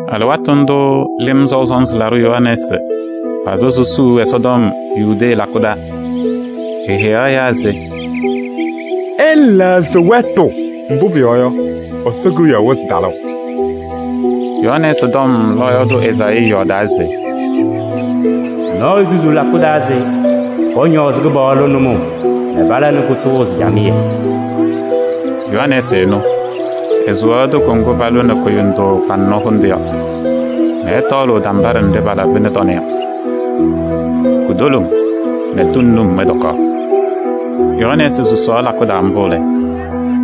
Alɩwaatʋ ndʋʋ Lɩm Sɔʋ Sɔnzɩ Laɖʋ Yohanɛɛsɩ pazɩ susuu Ɛsɔtɔm Yudee lakʋ taa. Eheyaɣ ɛyaa se: “Ɩlɛɣzɩ wɛtʋ, mbʋ pʋyɔɔ yɔ, Ɛsɔ Kewiyaɣ wɩzɩ talʋʋ.” Yohanɛɛsɩ tɔm lɔɔyaɣ tʋ Ezaayii yɔɔdaa se: “Nɔɔyʋ susuu lakʋ taa se pɔñɔɔzɩ Kɩpaɣlʋ nʋmɔʋ nɛ pala nɛ kʋtʋʋzɩ camɩyɛ.” Yohanɛɛsɩ ɛnʋ, esuwaɣ toko ŋgʋ palʋnɩ kʋyʋndʋʋ kpaŋnɔ hʋndʋ yɔ nɛ ɛtɔɔlʋʋ tambaɖɛ nɖɩ palabɩnɩ tɔnɛ yɔ. Kutoloŋ nɛ tʋŋ num ɛtɔkaɣ. Yohanɛɛsɩ susaɣ lakʋ taa mbʋ lɛ,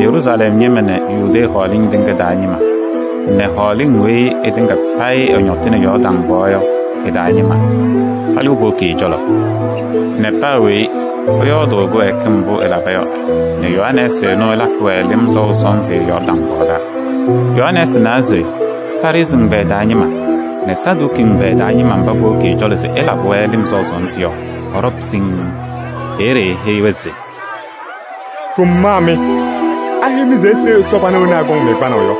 Yeruusalɛm ñɩma nɛ Yudee hɔɔlɩŋ tɩŋa taa ñɩma nɛ hɔɔlɩŋ weyi ɩtɩŋa payɩ ɩñɔtɩnɩ Yɔɔrdaŋ pɔɔ yɔ ɩ-taa ñɩma palɩɣ powoki ɛ-cɔlɔ nɛ paa weyi ɛyɔɔdʋʋ ɛ-kɩwɛɛkɩm mbʋ ɛlaba yɔ nɛ Yohanɛɛsɩ ɛnʋ ɛlakɩ-wɛ lɩm sɔʋ sɔnzɩ Yɔɔrdaŋ pɔɔ taa. Yohanɛɛsɩ nawa se Farɩsɩ ɛgbɛyɛ taa ñɩma nɛ Saduki ɛgbɛyɛ taa ñɩma mba powoki ɛ-cɔlɔ se ɛlabɩ-wɛ lɩm sɔʋ sɔnzɩ yɔ, pɔɖɔwa siŋŋ. Peeye eheyi-wɛ se: “Ɖʋmaa mɩ! Aheyi-mɩ se ise Ɛsɔ pana wena akɔŋ-mɩ kpanaʋ yɔ?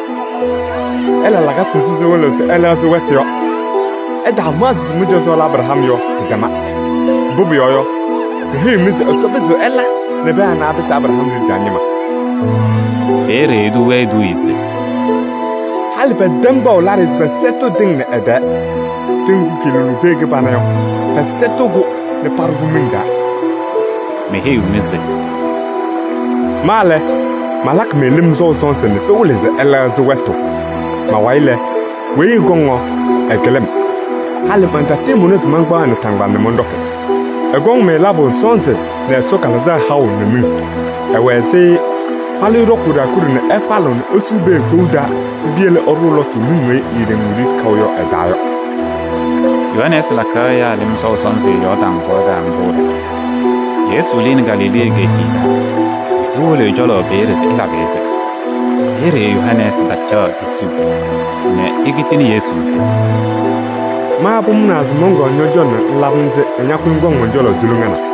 Ɩla lakasɩ nzɩ sɩwɩlɩɣ se ɩlɛɣzɩ wɛtʋ yɔ. Ɩtaamaɣzɩ se mɩ-cɔzɔ lɛ Abraham yɔ, pɩtɛma. Mbʋ pʋyɔɔ yɔ, meheyiɣ-mɩ se Ɛsɔ pɩzɩɣ ɛla nɛ pɛɛ anɛ apɩsɩ Abraham liɖe taa ñɩma.” Peeye etuu-wɛ eduuye se: “Halɩ pɛtɛm kpaɣʋ laɖɩyɛ se pɛsɛtɩɣ tɩŋ nɛ ɩ-tɛɛ: tɩʋ ŋgʋ kɩɩlʋlʋʋ pee kɩbana yɔ, pɛsɛtɩɣ-kʋ nɛ paɖʋ miŋ taa.” Meheyiɣ-mɩ se: “Ma lɛ, malakɩ-mɩ lɩm sɔʋ sɔnzɩ nɛ pɩwɩlɩ se ɩlɛɣzɩ wɛtʋ. Ma-wayɩ lɛ, weyi ɛkɔŋ yɔ, ɛkɩlɩ-m. Halɩ mantatɩɩmʋna se mankpaɣ ɛ-naataŋgbala nɛ mɔnɖɔkɩ. Ɛkɔŋ-mɩ labʋ sɔnzɩ nɛ Ɛsɔ Kalɩzaɣ haʋ nɛ miŋ. Ɛwɛ ɛzɩ falɩyʋ ɖɔkʋʋ ɖaakuɖe nɛ ɛfalɩɣ nɛ esuu pee kpou taa nɛ piyele ɛɖʋʋ lɔtʋ miŋ weyi eeɖeŋ wiɖiyi kaʋ yɔ ɛ-taa yɔ.” Yohanɛɛsɩ lakaɣ ɛyaa lɩm sɔʋ sɔnzɩ Yɔɔrdaŋ pɔɔ taa mbʋ lɛ, Yesu lɩnɩ Galilee egeetiye taa nɛ ewolo ɛ-cɔlɔ peeye se ɛlabɩ-ɩ-sɩ. Peeye Yohanɛɛsɩ tacaɣ tisuu nɛ ekitini Yesu se: “Ma pʋmʋnaa se mɔnkɔɔ ñɔ-cɔlɔ nɛ ŋlabɩ-m-sɩ nɛ ña ñakʋyɩ ŋkɔŋ mɔn-cɔlɔ tuliŋa na!”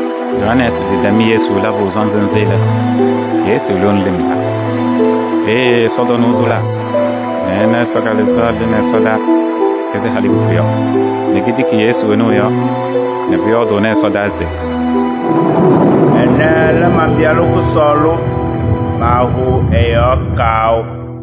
Yohanɛɛsɩ tɩtɛm Yesu labʋ sɔnzɩ nzɩ lɛ, Yesu lɩɣnɩ lɩm taa. Peeye ɛsɔtɔnʋʋ tʋlaa nɛ ɛna Ɛsɔ Kalɩzaɣ lɩ ɛsɔdaa ɛzɩ halikuku yɔ nɛ ketiki Yesu ɛnʋ ɛ-yɔɔ nɛ pʋyɔɔdʋʋnɩ ɛsɔdaa se: “Ɛnɛ lɛ man-Pɩyalʋ kʋsɔɔlʋ, maahʋʋ ɛ-yɔɔ kaʋ.”